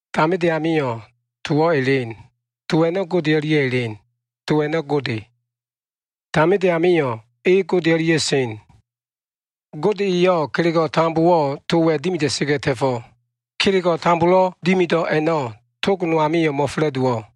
Taminde amio꞉ Towo꞉ elen. To a꞉no꞉ Gode o꞉lia꞉ elen. To a꞉no꞉ Gode. Taminde amio꞉ e Gode o꞉lia꞉ sen. Gode eyo꞉ kelego꞉ tambowo꞉ Towa꞉ dimida꞉sa꞉ga꞉ ta꞉fo꞉. Kelego꞉ tambolo꞉ dimido꞉ a꞉no꞉, tog no amilo꞉ mo꞉fa꞉la꞉dowo꞉.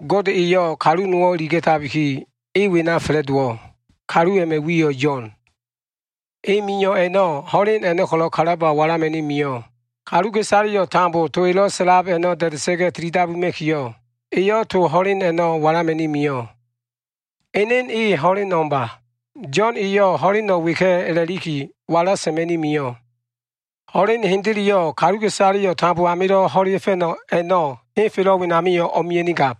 Gode eyo꞉ kalu nowo꞉ iliga꞉tabiki, e wena fa꞉la꞉dowo꞉. Kalu a꞉ma꞉ wiyo꞉ Yo꞉n. E mio꞉ a꞉no꞉, ho꞉len a꞉no꞉ ko꞉lo꞉ kalaba walama꞉ni mio꞉. Kaluka꞉isaleyo꞉ tambo to elo꞉ sa꞉lab a꞉no꞉ da꞉da꞉sa꞉ga꞉ tilidabuma꞉kiyo꞉, eyo꞉ to ho꞉len a꞉no꞉ walama꞉ni mio꞉. Enen e ho꞉len o꞉mba. Yo꞉n eyo꞉ ho꞉leno꞉ weka꞉ a꞉la꞉liki, wala sa꞉ma꞉ni mio꞉. Ho꞉len hendeleyo꞉, kaluka꞉isale tambo amilo꞉ ho꞉lea꞉fa꞉no꞉ a꞉no꞉ henfelo꞉ wenamio꞉ o꞉mia꞉nigab.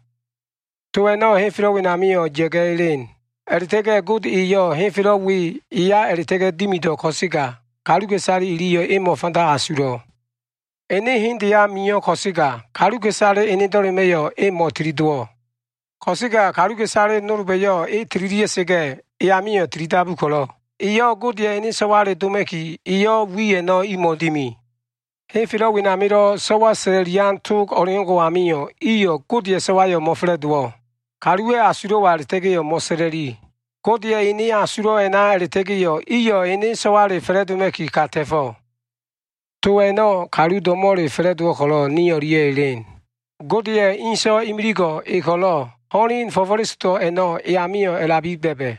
To a꞉no꞉ henfelo꞉ wenamio꞉ ya꞉ga꞉ elen. A꞉la꞉ta꞉ga꞉ Gode eyo꞉ henfelo꞉ we eya a꞉la꞉ta꞉ga꞉ dimido꞉ ko꞉sega, kaluka꞉isale iliyo꞉ e mo꞉fanda asulo꞉. Ene hendeya mio꞉ ko꞉sega, kaluka꞉isale enedo꞉lema꞉yo꞉ e mo꞉tili dowo꞉. Ko꞉sega kaluka꞉isale nolba꞉yo꞉ e tililia꞉sa꞉ga꞉, e amio꞉ tilidabu ko꞉lo꞉, iyo꞉ Godeya꞉ ene so꞉wale doma꞉ki, eyo꞉ wi a꞉no꞉ imo꞉wo꞉ dimi. Henfelo꞉ wenamilo꞉ so꞉wa sa꞉la꞉lian tog o꞉leo꞉ngo꞉ amio꞉ iyo꞉ Godeya꞉ so꞉wayo꞉ mo꞉fa꞉la꞉dowo꞉. Kaluwa꞉ asulo꞉wa a꞉la꞉ta꞉ga꞉yo꞉ mo꞉sa꞉la꞉li. Godeya꞉ enen asulo꞉ a꞉na a꞉la꞉ta꞉ga꞉yo꞉ iyo꞉ ene so꞉wale fa꞉la꞉doma꞉ki ka ta꞉fo꞉. To a꞉no꞉ kalu do꞉mo꞉le fa꞉la꞉dowo꞉ ko꞉lo꞉, ni o꞉lia꞉ elen. Godeya꞉ ene So꞉wa imiligo꞉ e ko꞉lo꞉, ho꞉len fo꞉fo꞉lesodo꞉ a꞉no꞉ e amio꞉ a꞉labi ba꞉ba꞉.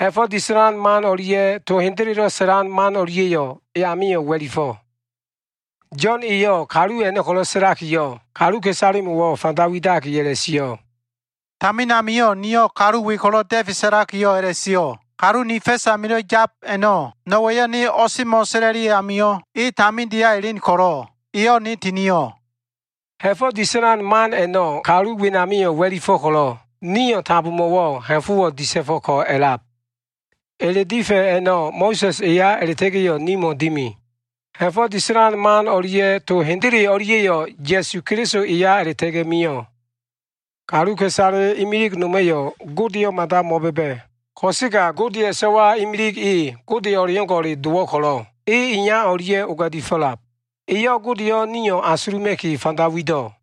Ha꞉fo꞉ disa꞉lan man o꞉lia꞉ to hendelelo꞉ sa꞉lan man o꞉lia꞉yo꞉ e amio꞉ wa꞉lifo꞉. Yo꞉n eyo꞉ kalu a꞉no꞉ ko꞉lo꞉ sa꞉lakiyo꞉, kaluka꞉isalemo꞉wo꞉ fanda widaki a꞉la꞉sio꞉, “Tamin amio꞉ niyo꞉ kalu we ko꞉lo꞉ da꞉fe sa꞉lakiyo꞉ a꞉la꞉sio꞉, ‘Kalu ni fa꞉s amilo꞉ yab a꞉no꞉, no꞉wa꞉yo꞉ ne o꞉semo꞉ sa꞉la꞉li amio꞉ e tamindeya elen ko꞉lo꞉ eyo꞉ ne tinio꞉.’” Ha꞉fo꞉ disa꞉lan man a꞉no꞉ kalu wenamio꞉ wa꞉lifo꞉ ko꞉lo꞉, nio꞉ tambomo꞉wo꞉ ha꞉fo꞉wo꞉ disa꞉fo꞉ko꞉ a꞉lab. Ele difa꞉ a꞉no꞉ Mo꞉sa꞉s eya a꞉la꞉ta꞉ga꞉yo꞉ nimo꞉ dimi. Ha꞉fo꞉ disa꞉lan man o꞉lia꞉ to hendele o꞉lia꞉yo꞉ Ya꞉su Keliso eya a꞉la꞉ta꞉ga꞉ mio꞉. Kaluka꞉isale imilig noma꞉yo꞉ Godeyo꞉ mada mo꞉ba꞉ba꞉. Ko꞉sega Godeya꞉ So꞉wa imilig e Gode o꞉leo꞉ngo꞉ dowo꞉ ko꞉lo꞉, e iya o꞉lia꞉ oga꞉di fo꞉lab. Eyo꞉ Godeyo꞉ nio꞉ asuluma꞉ki fanda wido꞉.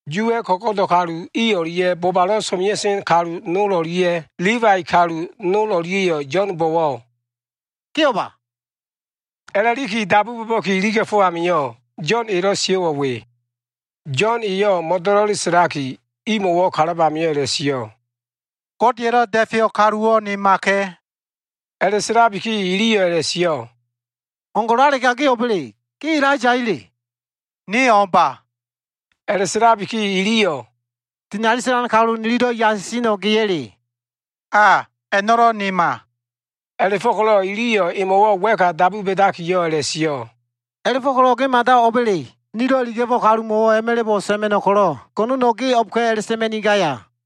Yuwa꞉ ko꞉go꞉do꞉ kalu i o꞉lia꞉, bobalo꞉ so꞉mea꞉sen kalu nol o꞉lia꞉, Libai kalu nol o꞉lia꞉yo꞉ Yo꞉nbo꞉wo꞉ “Ge o꞉ba?” a꞉la꞉liki dabu bo꞉ba꞉ki iliga꞉fo꞉ amio꞉, Yo꞉n elo꞉ sio꞉wo꞉ we. Yo꞉n eyo꞉ mo꞉do꞉lo꞉le sa꞉laki, imo꞉wo꞉ kalab amio꞉ a꞉la꞉sio꞉, “Godeya꞉lo꞉ Da꞉feyo꞉ kaluwo꞉ nemaka꞉.” A꞉la꞉sa꞉labiki, iliyo꞉ a꞉la꞉sio꞉, “O꞉ngo꞉lalega ge o꞉ba꞉le? Ge Elaiyaya꞉le?” “Ne o꞉mba.” A꞉la꞉sa꞉labiki iliyo꞉ “Dinali sa꞉lan kalu, nililo꞉ yasiseno꞉ geya꞉le?” “A, a꞉no꞉lo꞉ nema.” A꞉la꞉fo꞉ko꞉lo꞉ iliyo꞉ emo꞉wo꞉ wa꞉ka dabu ba꞉dakiyo꞉ a꞉la꞉sio꞉, “A꞉la꞉fo꞉ko꞉lo꞉ ge mada o꞉ba꞉le? Nilo꞉ iliga꞉fo꞉ kalumo꞉wo꞉ a꞉ma꞉la꞉bo꞉ sa꞉ma꞉no꞉ ko꞉lo꞉ go꞉no꞉no꞉ ge o꞉bka꞉ a꞉la꞉sa꞉ma꞉nigaya?”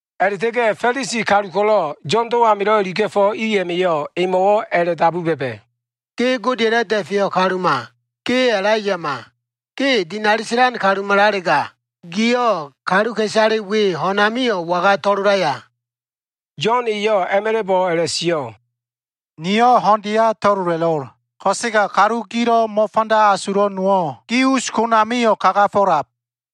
A꞉la꞉ta꞉ga꞉ Fa꞉lisi kalu ko꞉lo꞉ Yo꞉ndo꞉ amilo꞉ iliga꞉fo꞉ i a꞉ma꞉yo꞉ emo꞉wo꞉ a꞉la꞉dabu ba꞉ba꞉, “Ge Godeya꞉lo꞉ Da꞉feyo꞉ kaluma, ge Elaiyama, ge dinali sa꞉lan kalumalalega, giyo꞉ kaluka꞉isale we ho꞉n amio꞉ waga to꞉lolaya?” Yo꞉n eyo꞉ a꞉ma꞉la꞉bo꞉ a꞉la꞉sio꞉, “Niyo꞉ ho꞉ndeya to꞉lola꞉lo꞉l. Ko꞉sega kalu gilo꞉ mo꞉fanda asulo꞉ nowo꞉ gi us konamio꞉ kagafo꞉lab.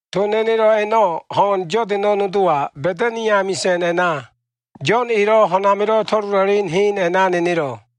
To nenelo꞉ a꞉no꞉ ho꞉n Yodano꞉ nodowa, Ba꞉tani amisa꞉n a꞉na, Yo꞉n elo꞉ ho꞉n amilo꞉ to꞉lola꞉len hen a꞉na nenelo꞉.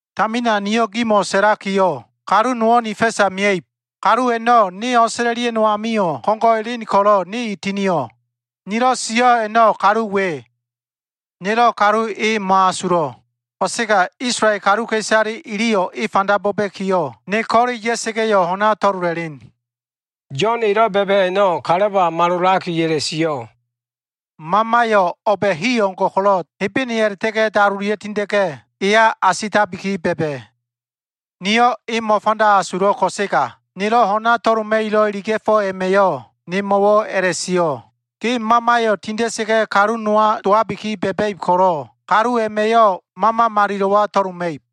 Tamina niyo꞉ gimo꞉ sa꞉lakiyo꞉, ‘Kalu nowo꞉ ni fa꞉sa mia꞉ib. Kalu a꞉no꞉ ne o꞉sa꞉la꞉lia꞉no꞉ amio꞉ ko꞉ngo꞉ elen ko꞉lo꞉, ne e tinio꞉.’ Nilo꞉ sio꞉ a꞉no꞉ kalu we. Nelo꞉ kalu e mo꞉asulo꞉. Ko꞉sega Isolael kaluka꞉isale iliyo꞉ e fanda bo꞉ba꞉kiyo꞉, ne ko꞉le ya꞉sa꞉ga꞉yo꞉ ho꞉na to꞉lola꞉len.” Yo꞉n elo꞉ ba꞉ba꞉ a꞉no꞉ kalaba malolaki a꞉la꞉sio꞉, “Mamayo꞉ o꞉ba꞉ hi o꞉ngo꞉ ko꞉lo꞉ Hebene a꞉la꞉ta꞉ga꞉ dalolia꞉ tinda꞉ga꞉, eya asitabiki ba꞉ba꞉. Niyo꞉ e mo꞉fanda asulo꞉ ko꞉sega, nilo꞉ ho꞉na to꞉loma꞉kilo꞉ iliga꞉fo꞉ a꞉ma꞉yo꞉ nemo꞉wo꞉ a꞉la꞉sio꞉, ‘Ge Mamayo꞉ tinda꞉sa꞉ga꞉ kalu nowa dowabi ba꞉ba꞉ib ko꞉lo꞉, kalu a꞉ma꞉yo꞉ Mama Malilo꞉wa to꞉loma꞉ib.’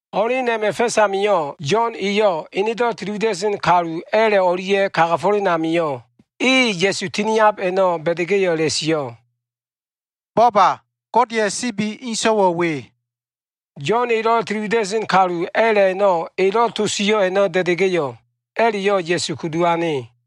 Ho꞉len a꞉ma꞉ fa꞉s amio꞉, Yo꞉n eyo꞉ enedo꞉ tili wida꞉sen kalu a꞉la꞉ o꞉lia꞉ kagafo꞉len amio꞉, e Ya꞉su tiniab a꞉no꞉ ba꞉da꞉ga꞉yo꞉ a꞉la꞉sio꞉, “Bo꞉ba! Godeya꞉ sibi inso꞉wo꞉ we.” Yo꞉n elo꞉ tili wida꞉sen kalu a꞉la꞉ a꞉no꞉ elo꞉ to sio꞉ a꞉no꞉ da꞉da꞉ga꞉yo꞉, a꞉la꞉yo꞉ Ya꞉su kudu ane.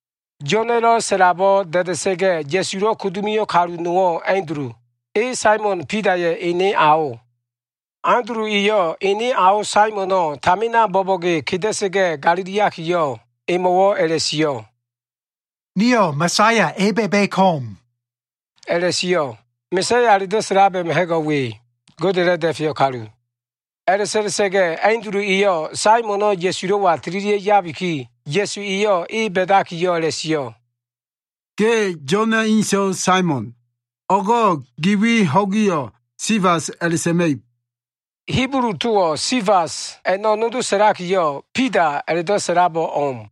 Yo꞉na꞉lo꞉ sa꞉labo꞉ da꞉da꞉ga꞉ Ya꞉sulo꞉ kudu mio꞉ kalu nowo꞉ Andulu. E Saimon Bidaya꞉ ene ao. Andulu eyo꞉ ene ao Saimono꞉ tamina bo꞉bo꞉ge keda꞉sa꞉ga꞉ galiliakiyo꞉, emo꞉wo꞉ a꞉la꞉sio꞉, “Nio꞉ Ma꞉saya e ba꞉ba꞉ ko꞉m” a꞉la꞉sio꞉. Ma꞉saya a꞉la꞉do꞉ sa꞉lab a꞉ma꞉ ha꞉go꞉ we, Godeya꞉lo꞉ Da꞉feyo꞉ kalu. A꞉la꞉sa꞉la꞉sa꞉ga꞉ Andulu eyo꞉ Saimon e Ya꞉sulo꞉wa tililia꞉ yabiki, Ya꞉su eyo꞉ e ba꞉dakiyo꞉ a꞉la꞉sio꞉, “Ge Yo꞉na꞉ inso꞉ Saimon. O꞉go꞉ gi wi ho꞉giyo꞉ Sifas a꞉la꞉sa꞉ma꞉ib.” Hibulu towo꞉ Sifas a꞉no꞉ nodo sa꞉lakiyo꞉, Bida a꞉la꞉do꞉ sa꞉labo꞉ o꞉m.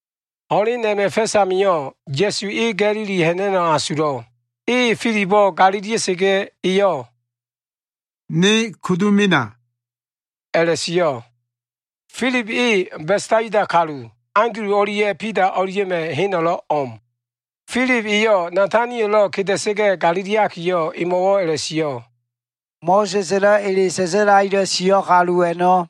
Ho꞉len a꞉ma꞉ fa꞉s amio꞉, Ya꞉su e Ga꞉lili ha꞉na꞉no꞉ asulo꞉. E Filibo꞉ galilia꞉sa꞉ga꞉, eyo꞉ “ne kudu mena” a꞉la꞉sio꞉. Filib e Besaida kalu. Andulu o꞉lia꞉ Bida o꞉lia꞉ma꞉ heno꞉lo꞉ o꞉m. Filib eyo꞉ Natanielo꞉ keda꞉sa꞉ga꞉ galiliakiyo꞉, emo꞉wo꞉ a꞉la꞉sio꞉, “Mo꞉sa꞉s elo꞉ ele sa꞉sa꞉lakilo꞉ sio꞉ kalu a꞉no꞉,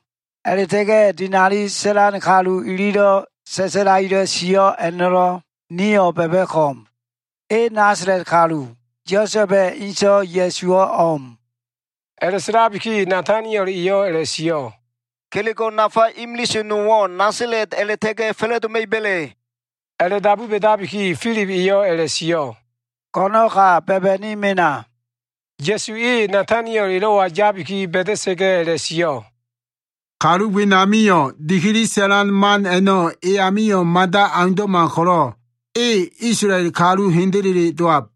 a꞉la꞉ta꞉ga꞉ dinali sa꞉lan kalu ililo꞉ sa꞉sa꞉lakilo꞉ sio꞉ a꞉no꞉lo꞉ nio꞉ ba꞉ba꞉ ko꞉m. E Nasala꞉t kalu, Yosa꞉ba꞉ inso꞉ Ya꞉suwo꞉ o꞉m.” A꞉la꞉sa꞉labiki Nataniel eyo꞉ a꞉la꞉sio꞉, “Kelego꞉ nafa imilise nowo꞉ Nasala꞉t a꞉la꞉ta꞉ga꞉ fa꞉la꞉doma꞉iba꞉le?” A꞉la꞉dabu ba꞉dabiki, Filib eyo꞉ a꞉la꞉sio꞉, “Go꞉no꞉n ka ba꞉ba꞉ni mena.” Ya꞉su e Nataniel elo꞉wa yabi ba꞉da꞉sa꞉ga꞉ a꞉la꞉sio꞉, “Kalu wenamio꞉ dikili sa꞉lan man a꞉no꞉ e amio꞉ mada aundo꞉ma ko꞉lo꞉, e Isolael kalu hendele dowab.”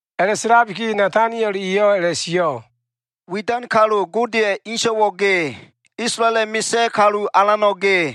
A꞉la꞉sa꞉labiki Nataniel eyo꞉ a꞉la꞉sio꞉ “Widan kalu, Godeya꞉ ene So꞉wayo꞉ ge. Isolaela꞉ misa꞉ kalu alano꞉ ge.”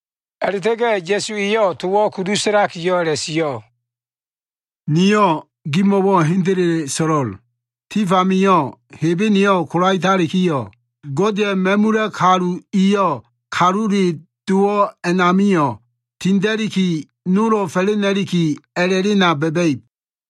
A꞉la꞉ta꞉ga꞉ Ya꞉su eyo꞉ towo꞉ kudu sa꞉lakiyo꞉ a꞉la꞉sio꞉, “Niyo꞉ gimo꞉wo꞉ hendele so꞉lo꞉l. Tif amio꞉ Hebeneyo꞉ kolaetalikiyo꞉, Godeya꞉ ma꞉mula꞉ kalu iyo꞉ Kalule Dowo꞉ a꞉namio꞉ tinda꞉liki nolo꞉ fa꞉la꞉nda꞉liki a꞉la꞉lena ba꞉ba꞉ib.”